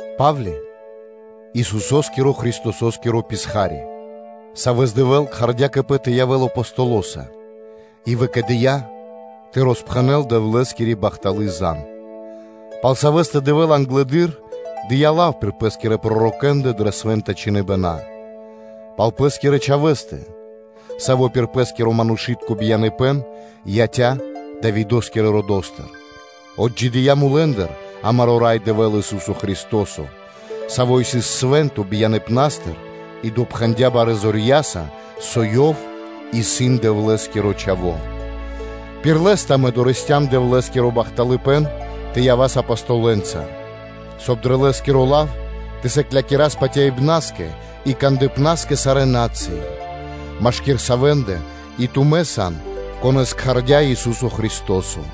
Па́вли, Исусо́скиро Христосо́скиро писха́ри (рабо), савэ́с Дэвэ́л кхардя́ кэ Пэ тэ явэ́л Апостолоса и выкэдыя́ тэ роспхэнэл Дэвлэ́скири бахталы́ зан (звесь), пал савэ́стэ Дэвэ́л англэды́р дыя́ лав пир Пэ́скирэ пророкэ́ндэ дрэ Свэ́нта Чхиныбэна, пал Пэ́скирэ Чхавэ́стэ, Саво́ пир Пэ́скиро манушы́тко бияныпэ́н яця́ Давидо́скирэ родо́стыр, отджидыя́ мулэ́ндыр, амаро́ Рай Дэвэ́л Ису́со Христо́со, Саво́ сыс свэ́нто бияныпнастыр и допхэндя барэ́ зорья́са, со Ёв исын Дэвлэ́скиро Чхаво́; пир Лэ́стэ амэ дорэсцям (долыям) Дэвлэ́скиро бахталыпэ́н тэ явас Апостолэ́нца, соб (кай) дрэ Лэ́скиро лав тэ сыклякирас патяибна́скэ и кандыпна́скэ сарэ́ на́цыи, машки́р савэ́ндэ и тумэ́ сан, конэ́с кхардя́ Ису́со Христо́со: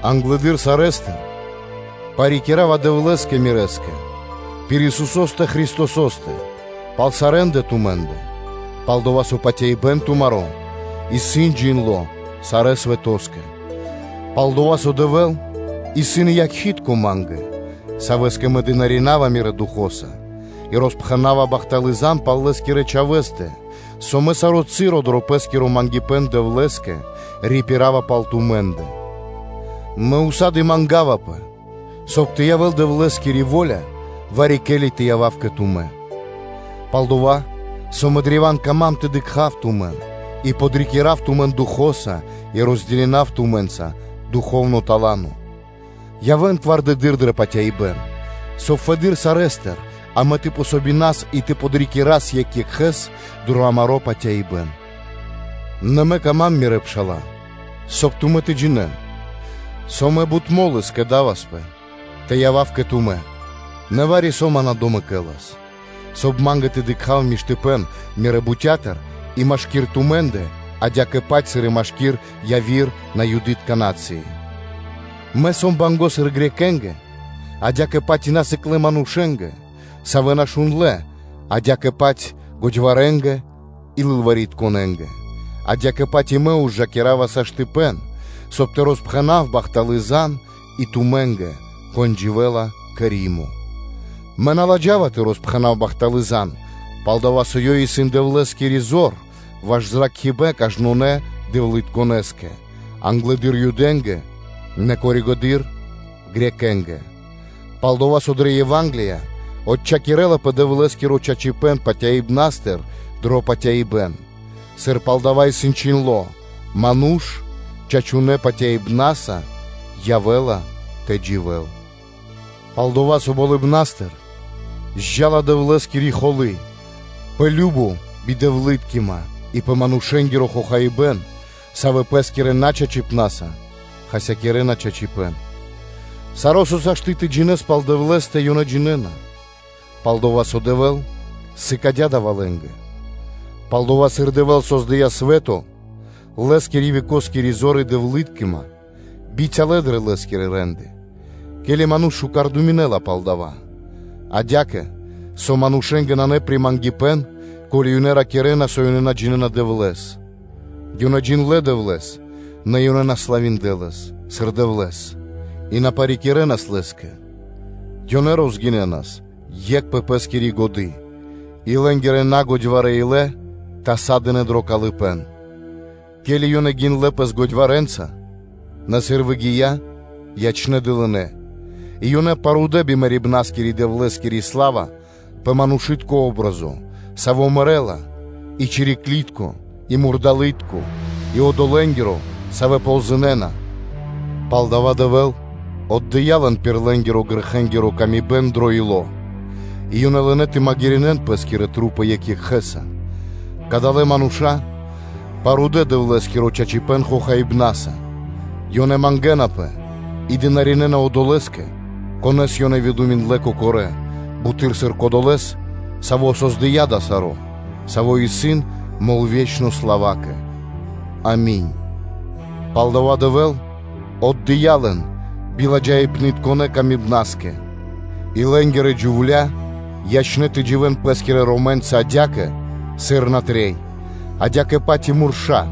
Англыдыр сарэ́стыр мэ парикирава Дэвлэ́скэ Мирэ́скэ пир Исусо́стэ Христосо́стэ пал сарэ́ндэ тумэ́ндэ, пал-дова́ со патяибэ́н тумаро́ исын джиндло́ сарэ́ свэтоскэ. Пал-дова́ со Дэвэ́л исын якхи́тко (свидетелё) ма́нгэ, Савэ́скэ мэ дынарина́ва (служына́ва) мирэ́ духо́са и роспхэнава бахталы́ звесь пал Лэ́скирэ Чхавэ́стэ, со мэ саро́ часо дрэ пэ́скиро мангипэ́н Дэвлэ́скэ рипирава пал тумэ́ндэ, мэ ўса́ды (сак) мангавапэ, соб (кай) тэ явэ́л Дэвлэ́скири во́ля, вари-ке́ли тэ явав кэ тумэ́. Пал-дова́ со мэ древа́н кама́м тэ дыкха́в тумэн, и тэ подрикирав тумэн Духо́са и розделинав тумэ́нца духовно тала́но: явэ́н зоралэды́р дрэ патяибэ́н; соб (кай) фэды́р сарэ́стыр амэ тэ помогинас и тэ подрикирас екх екхэ́с дро амаро́ патяибэ́н. Нэ мэ кама́м, мирэ́ пша́ла, соб (кай) тумэ́ тэ джинэ́н, со мэ бут мо́лы скэдаваспэ тэ явав кэ тумэ́, нэ вари-со ман на домэкэлас, соб (кай) ма́нгэ тэ дыкха́в миштыпэ́н мирэ́ бутя́тыр и машки́р тумэ́ндэ, адя́кэ-паць сыр и машки́р яви́р на́цыи. Мэ сом банго́ сыр Элинэнгэ (Грекэ́нгэ), адя́кэ-паць и насыклэ манушэ́нгэ, савэ́ на шундлэ́, адя́кэ-паць годьварэнгэ и бигодякирэнгэ: адя́кэ-паць и мэ ужакирава, ко́ли сашты́, соб (кай) тэ роспхэнав бахталы́ зан (звесь) и тумэ́нгэ, кон дживэ́ла кэ Римо. Мэ на ладжава тэ роспхэнав бахталы́ зан (звесь), пал-дова́ со ёй исын Дэвлэ́скири зор ваш зракхибэ́н кажнонэ́скэ дэвлытконэскэ: англэды́р Юдэ́нгэ, нэ коригэды́р (тэ́ньчи) Элинэ́нгэ (Грекэ́нгэ/Баламэ́нгэ): пал-дова́ со дрэ Ева́нгелия отчхакирэлапэ Дэвлэ́скиро чачипэ́н патяибнастыр дро патяибэ́н: сыр пал дава́ исын чхиндло́: “Ману́ш чачунэ́ патяибна́са явэ́ла тэ дживэ́л.” Пал-дова́ со болыбна́стыр зджа́ла Дэвлэ́скири холы́ пэ кажно бидэвлыткима и пэ манушэ́нгиро хохаибэ́н, савэ́ пэ́скирэ начачипнаса хасякирэна чачипэ́н. Саро́, со сашты́ джиндло́ тэ джинэ́н пал Дэвлэ́стэ, ёнэ джинэ́на, пал-дова́ со Дэвэ́л сыкадя́ дава́ лэ́нгэ. Пал-дова́, сыр Дэвэ́л создыя́ свэ́то, Лэ́скири векоскири зор и Дэвлыткима бицялэ дрэ Лэ́скирэ рэ́нды (де́лы), ке́ли ману́ш шука́р думинэ́ла пал дава́; адя́кэ со манушэ́нгэ нанэ примангипэн, ко́ли ёнэ ракирна, со ёнэ на джинэ́на Дэвлэ́с. Ёнэ джиндлэ́ Дэвлэ́с, нэ ёнэ на славиндлэ Лэс, сыр Дэвлэ́с, и на парикирэнас Лэ́скэ: ёнэ ячнэ́ тэ кошэнпэ, ке́ли пириракирэнас, и лэ́нгирэ нагодьварэ илэ тасадынэ дро калыпэ́н: ке́ли ёнэ гиндлэ́ пэс годьварэнца, нэ сыр выгия́, ячнэ́ дылынэнца, и ёнэ парудэ бимэрибнаскири Дэвлэ́скири сла́ва пэ манушы́тко о́бразо, саво́ мэрэ́ла, и чириклытко, и мурдалытко и одолэнгиро, савэ́ ползынэна. Палдава́ Дэвэ́л отдыя́ лэн пир лэ́нгирэ-грэхэнгиро камибэн дро ило́ и ёнэ лынэ́ тэ магирэ́н пэ́скирэ маса́ екх екхэ́са: кадалэ́ мануша́ парудэ Дэвлэ́скиро чачипэ́н хохаибнаса, ёнэ мангэ́напэ и дынаринэна (служынэна) одолэ́скэ, конэ́с ёнэ выдуминдлэ кокорэ́, буты́р сыр Кодолэ́скэ, Саво́ кэрдя́ дава́ саро́, Саво́ исын мол вечнонэ славакэ. Ами́нь. Палдава́ Дэвэ́л отдыя́ лэн биладжаипнытконэ камибнаскэ: и лэ́нгирэ джувля́ парудынэ тэ дживэ́н пэ́скирэ ромэнца адя́кэ, сыр натрэй; адя́кэ-паць и мурша́,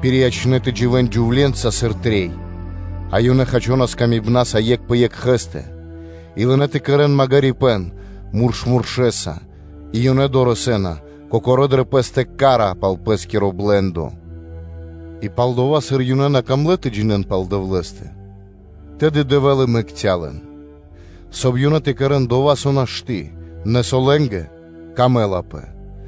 пириячнэ тэ дживэ́н джувле́нца, сыр трэй, а ёнэ хачонас камибнаса екх пэ екхэ́стэ, и лынэ́ тэ кэрэ́н магирипэ́н мурш муршэса, и ёнэ дорэсэ́на (долэна) кокорэ́ дрэ пэ́стэ ка́ра пал пэ́скиро блэ́ндо. И пал-дова́, сыр ёнэ на камлэ́ тэ джинэ́н пал Дэвлэ́стэ, тэды Дэвэ́л и мэкця́ лэн, соб (кай) ёнэ тэ кэрэ́н пир налачхи годы́, нэ со лэ́нгэ камэлапэ;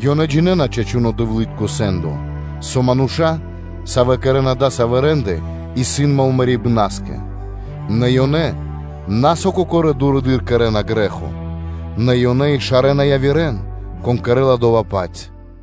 ёнэ джинэ́на чачуно́ Дэвлы́тко сэ́ндо, со мануша́, савэ́ кэрэ́на дасавэ́ рэ́нды исын мол мэрибна́скэ, нэ ёнэ на, со кокорэ́ дурэды́р кэрэ́на грэ́хо, нэ ёнэ и шарэна явирэ́н, кон кэрэ́ла дова́-паць.